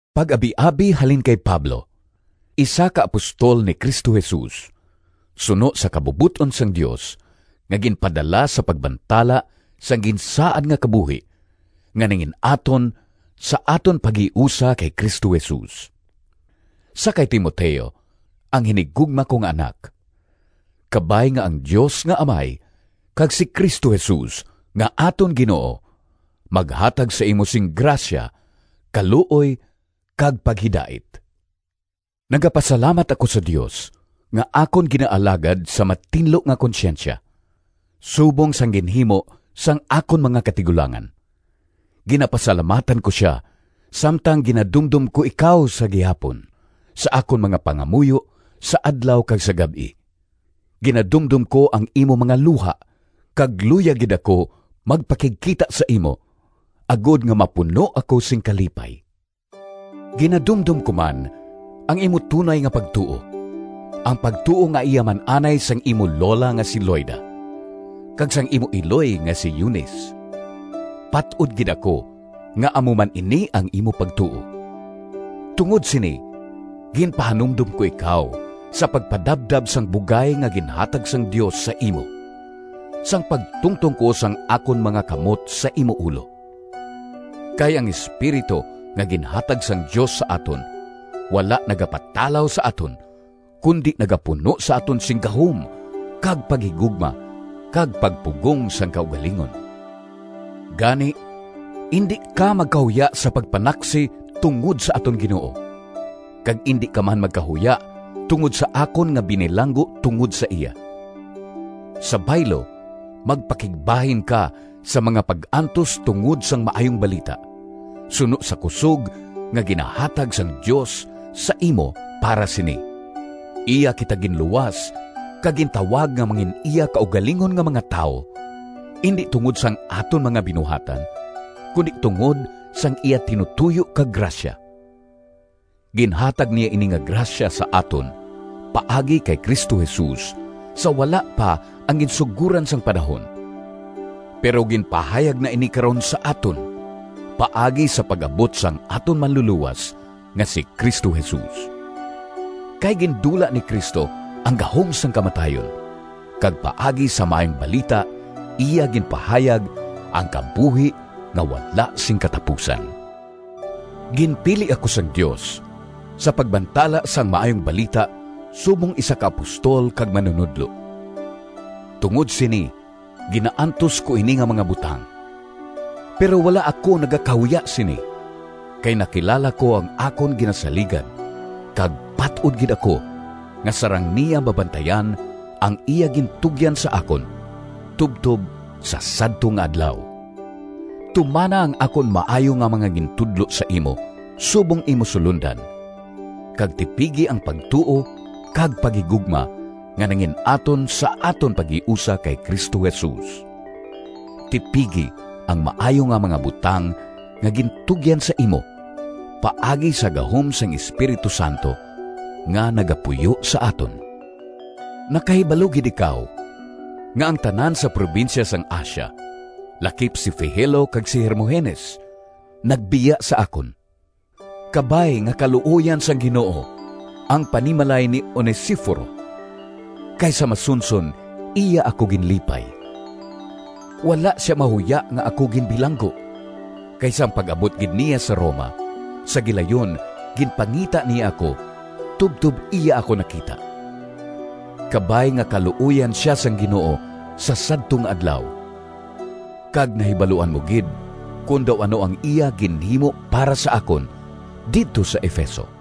Pag-abiabi halin kay Pablo, isa ka apostol ni Cristo Jesus suno sa kabubot-on sang Dios, nga ginpadala sa pagbantala sang ginsaad nga kabuhi nga nangin-aton sa aton paghiusa kay Cristo Jesus— Sa kay Timoteo, ang hinigugma ko nga anak: Kabay nga ang Dios nga Amay kag si Cristo Jesus nga aton Ginoo maghatag sa imo sing grasya, kaluoy kag paghidait. Nagapasalamat ako sa Dios nga akon ginaalagad sa matinlo nga konsyensya, subong sang ginhimo sang akon mga katigulangan. Ginapasalamatan ko sia samtang ginadumdom ko ikaw sa gihapon sa akon mga pangamuyo sa adlaw kag sa gab-i. Ginadumdom ko ang imo mga luha kag luyag gid ako magpakigkita sa imo, agod nga mapuno ako sing kalipay. Ginadumdom ko man ang imo tunay nga pagtuo, ang pagtuo nga iya man anay sang imo lola nga si Loida, kag sang imo iloy nga si Eunice. Pat-od gid ako nga amo man ini ang imo pagtuo. Tungod sini ginpahanumdom ko ikaw sa pagpadabdab sang bugay nga ginhatag sang Dios sa imo, sang pagtungtong ko sang akon mga kamot sa imo ulo. Kay ang Espiritu nga ginhatag sang Dios sa aton wala nagapatalaw sa aton, kundi nagapuno sa aton sing gahom kag paghigugma kag pagpugong sang kaugalingon. Gani, indi ka magkahuya sa pagpanaksi tungod sa aton Ginoo, kag indi ka man magkahuya tungod sa akon nga binilanggo tungod sa iya. Sa baylo, magpakigbahin ka sa mga pag-antos tungod sang Maayong Balita, suno sa kusog nga ginahatag sang Dios sa imo para sini. Iya kita ginluwas kag gintawag nga mangin-iya kaugalingon nga mga tawo, indi tungod sang aton mga binuhatan, kundi tungod sang iya tinutoyo kag grasya. Ginhatag niya ini nga grasya sa aton paagi kay Cristo Jesus sa wala pa ang ginsugoran sang panahon. Pero ginpahayag na ini karon sa aton paagi sa pag-abot sang aton Manlulowas nga si Cristo Jesus. Kay gindula ni Cristo ang gahom sang kamatayon, kag paagi sa Maayong Balita iya ginpahayag ang kabuhi nga wala sing katapusan. Ginpili ako sang Dios sa pagbantala sang Maayong Balita subong isa ka apostol kag manunodlo. Tungod sini ginaantos ko ini nga mga butang. Pero wala ako nagakahuya sini, kay nakilala ko ang akon ginasaligan kag pat-od gid ako nga sarang niya mabantayan ang iya gintugyan sa akon tubtob sa sadto nga Adlaw. Tumana ang akon maayo nga mga gintudlo sa imo subong imo sulondan, kag tipigi ang pagtuo kag paghigugma nga nangin-aton sa aton paghiusa kay Cristo Jesus. Tipigi ang maayo nga mga butang nga gintugyan sa imo paagi sa gahom sang Espiritu Santo nga nagapuyo sa aton. Nakahibalo gid ikaw nga ang tanan sa probinsya sang Asia, lakip si Figelo kag si Hermogenes, nagbiya sa akon. Kabay nga kaluoyan sang Ginoo ang panimalay ni Onesiforo, kay sa masunson iya ako ginlipay. Wala sia mahuya nga ako ginbilanggo, kay sang pag-abot gid niya sa Roma, sa gilayon ginpangita niya ako tubtob iya ako nakita. Kabay nga kaluoyan sia sang Ginoo sa sadto nga Adlaw! Kag nahibaluan mo gid kon daw ano ang iya ginhimo para sa akon didto sa Efeso.